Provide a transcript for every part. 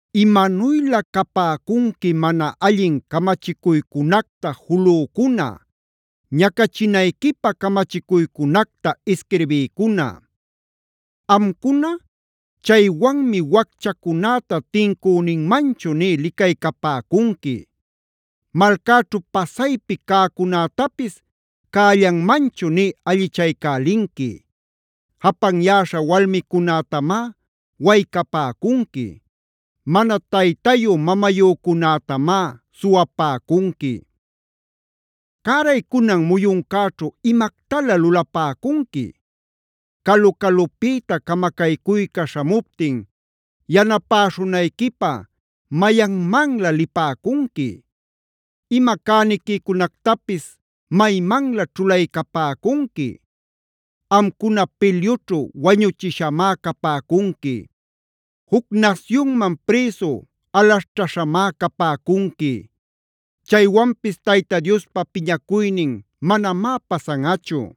¡Imanuylä capäcunqui mana allin camachicuycunacta julücuna, ñacachinayquipä camachicuycunacta isquirbïcuna! Amcuna chaywanmi wacchacunäta tincüninmanchu nï licaycapäcunqui; malcäćhu pasaypi cäcunätapis cällanmanchu nï allichaycälinqui. ¡Japanyäśha walmicunätamá waycapäcunqui! ¡Mana taytayu-mamayücunätamá suwapäcunqui! ¿Cäraycunan muyuncäćhu imactalä lulapacunqui? Calu-calupïta camacaycuyca śhamuptin, ¿yanapäśhunayquipä mayanmanlä lipäcunqui? ¿Ima cäniquicunactapis maymanlä ćhulaycapäcunqui? Amcuna pilyućhu wañuchishamá capäcunqui; juc nasyunman prïsu alaśhćhaśhamá capäcunqui. Chaywanpis Tayta Diospa piñacuynin manamá pasanꞌachu;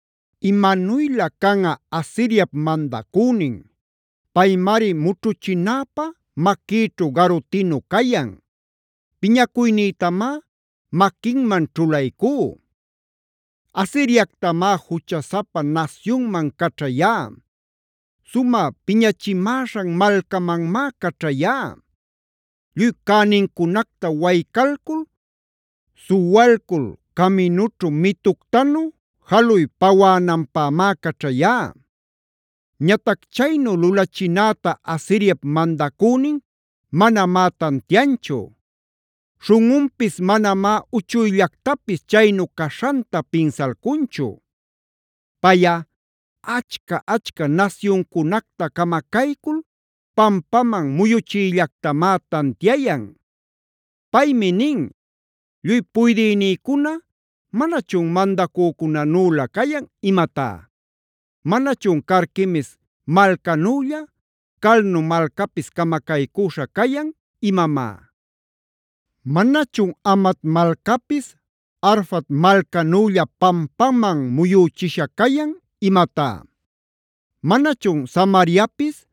¡Imanuylä canꞌa Asiriapb mandacünin! Paymari mućhuchinäpä maquïćhu garutinu cayan; piñacuynïtamá maquinman ćhulaycú. Asiriactamá juchasapa nasyunman caćhayá; sumä piñachimäśhan malcamanmác caćhayá. Lluy cänincunacta waycalcul, suwalcul caminućhu mituctanu jaluy pawänanpämá caćhayá. Ñatac chaynu lulachinäta Asiriap mandacünin manamá tantianchu; śhunꞌunpis manamá uchuyllactapis chaynu caśhanta pinsalcunchu. Payꞌa achca-achca nasyuncunacta camacaycul pampaman muyuchiyllactamá tantiayan. Paymi nin: “¿Lluy puydïnïcuna manachun mandacücunänülä cayan imatá? ¿Manachun Carquemis malcanülla Calno malcapis camacaycüśha cayan imamá? ¿Manachun Hamat malcapis Arfad malcanülla pampaman muyüchisha cayan imatá? ¿Manachun Samariapis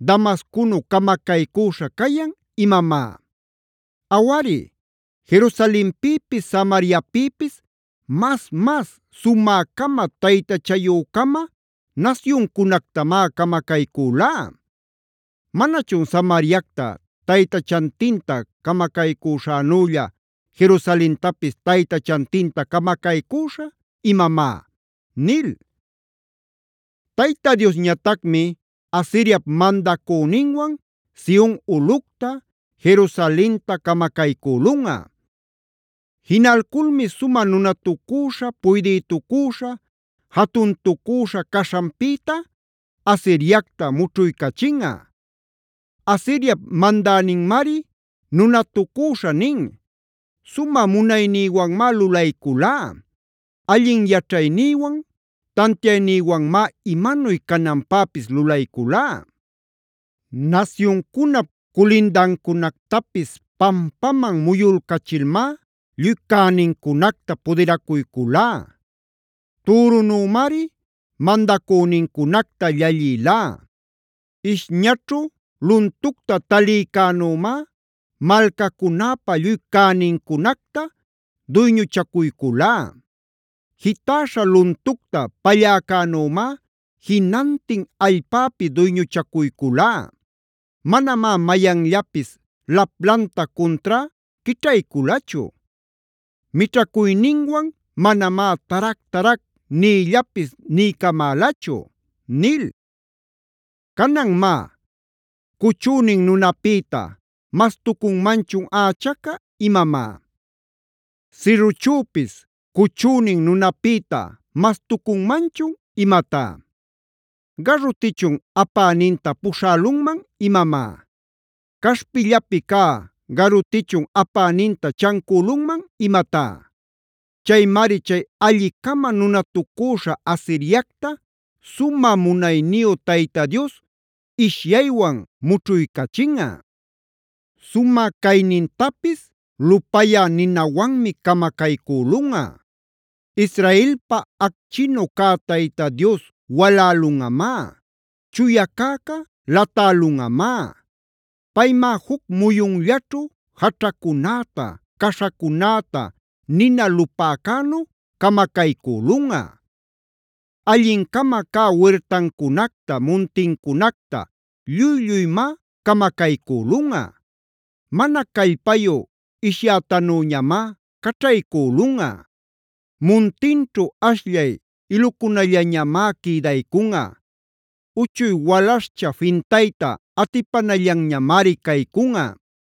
Damasconu camacaycüśha cayan imamá? Awari, Jerusalenpïpis, Samariapïpis mas-mas sumä-cama, taytachayü-cama nasyuncunactamá camacaycülá. ¿Manachun Samariacta taytachantinta camacaycüśhänülla Jerusalentapis taytachantinta camacaycüśhä imamá?” nil. Tayta Diosñatacmi Asiriap mandacüninwan Sion ulꞌucta, Jerusalenta camacaycülunꞌa.d Jinalculmi sumä nunatacüśha, puydïtucüśha, jatuntücüśha caśhanpïta Asiriacta mućhuycachinꞌa. Asiriap mandäninmari nunatucüśha nin: “Sumä munaynïwanmá lulayculá. Allin yaćhaynïwan, tantiaynïwanmá imanuy cananpäpis lulayculá. Nasyuncunap culindancunactapis pampaman muyulcachilmá lluy cänincunacta pudiracuyculá. Türunümari mandacünincunacta llallïlá. Ishñaćhu luntucta talïcänümá malcacunäpa lluy cänincunacta duyñuchacuyculá. Jitäśha luntucta palläcänümá jinantin allpäpi duyñuchacuyculá. Manamá mayanllapis laplanta cuntrá quićhayculachu; mićhacuyninwan manamá tarac-tarac niyllapis niycamälachu” nil. Canan má, ¿cuchünin nunapïta mas-tucunmanchun ächaca imamá? ¿Sirruchüpis cuchünin nunapïta mas-tucunmanchun imatá? ¿Garutichun apäninta puśhälunman imamá? ¿Caśhpillapi cä garutichun apäninta chancülunman imatá? Chaymari chay alli-cama nunatucüśha Asiriacta sumä munayniyu Tayta Dios ishyaywan mućhuycachinꞌa; sumä caynintapis lupayä ninawanmi camacaycülunꞌa. Israelpa acchinnu cä Tayta Dios walälunꞌamá; chuya cäca latälunꞌamá. Paymá juc muyunllaćhu jaćhacunäta, caśhacunäta nina lupäcänu camacaycülunꞌa. Allin-cama cä wirtancunacta muntincunacta lluy-lluymá camacaycülunꞌa. Mana callpayu ishyätanüñamá caćhaycülunꞌa. Muntinćhu ashllay ilucunallañamá quïdaycunꞌa; uchuy walaśhcha fintayta atipanallanñamari caycunꞌa.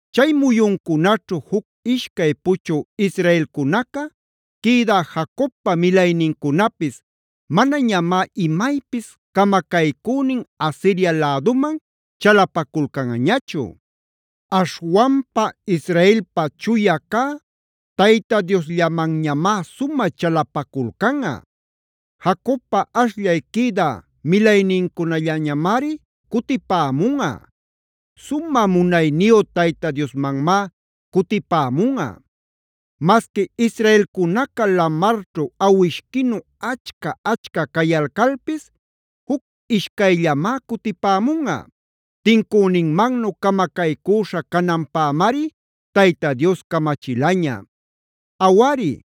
Chay muyuncunaćhu juc-ishcay puchü israelcunaca, quïdä Jacobpa milaynincunapis manañamá imaypis camacaycünin Asiria läduman chalapaculcanꞌañachu. Aśhwanpa Israelpa Chuya cä Tayta Diosllamanñamá sumä chalapaculcanꞌa. Jacobpa ashllay quïdä milaynincunallañamari cutipämunꞌa; sumä munayniyu Tayta Diosmanmá cutipämunꞌa. Masqui israelcunaca lamarćhu awishquinu achca-achca cayalcalpis, juc ishcayllamá cutipämunꞌa. Tincüninmannu camacaycüśha cananpämari Tayta Dios camachilaña. Awari,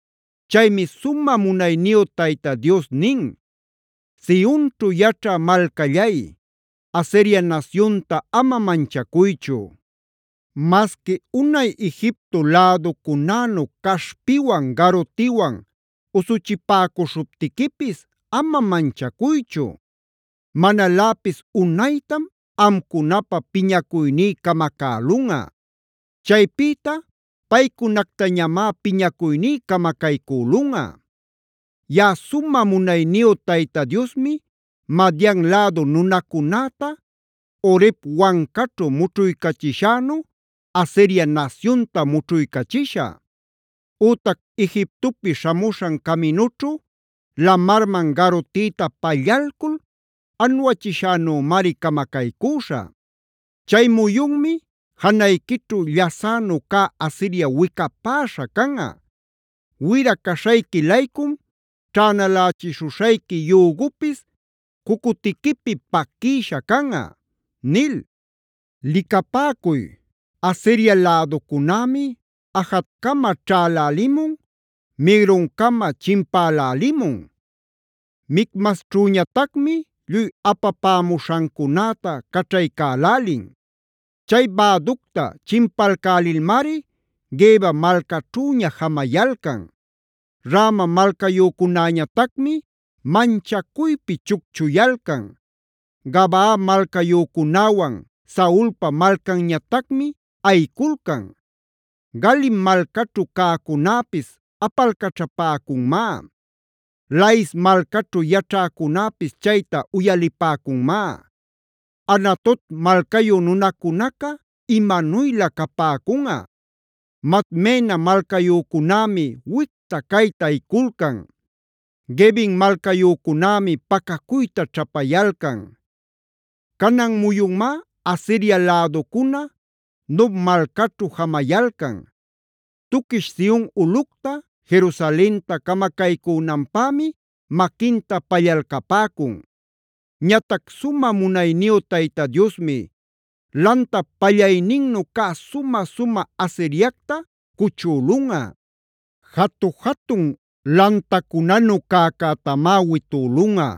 Chaymi sumä munayniyu Tayta Dios nin: “Sionćhu yaćhä malcallay, Asiria nasyunta ama manchacuychu. Masqui unay Egipto läducunänu caśhpiwan, garutiwan usuchipäcuśhuptiquipis ama manchacuychu. Manaläpis unaytam amcunapä piñacuyní camacälunꞌa; chaypïta paycunactañamá piñacuyní camacaycülunꞌa. Yaꞌa sumä munayniyu Tayta Diosmi Madian lädu nunacunäta Oreb wancaćhu mućhuycachishänu,f Asiria nasyunta mućhuycachishä; ütac Egiptopi śhamuśhan caminućhu lamarman garutïta pallalcul anuachiśhänümari camacaycüśhä. “Chay muyunmi janayquićhu llasänu cä Asiria wicapäśha canꞌa. Wira caśhayqui-laycum ćhänalächishuśhayqui yügupis cucutiquipi paquïsha canꞌa” nil. Licapäcuy, Asiria läducunämi Ajat-cama ćhalälimun, Migron-cama chimpälälimun; Micmasćhüñatacmi lluy apapämuśhancunäta caćhaycälälin. Chay bäducta chimpalcälilmari Geba malcaćhüña jamayalcan. Rama malcayücunäñatacmi manchacuypi chucchuyalcan, Gabaa malcayücunäwan Saulpa malcanñatacmi ayiculcan. Galim malcaćhu cäcunäpis apalcaćhapäcunmá. Lais malcaćhu yaćhäcunäpis chayta uyalipäcunmá. Anatot malcayu nunacunaca imanuylä capäcunꞌa. Madmena malcayücunämi wicta-cayta ayiculcan; Gebim malcayücunämi pacacuyta ćhapayalcan. Canan muyunmá Asiria läducuna Nob malcaćhu jamayalcan. Tuquish Sion ulꞌucta, Jerusalenta camacaycünanpämi maquinta pallalcapäcun. Ñatac sumä munayniyu Tayta Diosmi, lantap pallayninnu cä sumä-sumä Asiriacta cuchülunꞌa. Jatu-jatun lantacunanu cäcätamá witülunꞌa;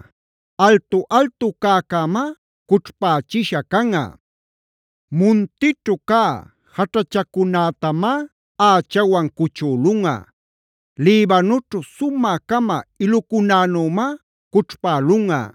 altu-altu cäcämá cućhpächisha canꞌa. Muntićhu cä jaćhachacunätamá ächawan cuchülunꞌa; Libanoćhu sumä-cama ilucunänümá cućhpälunꞌa.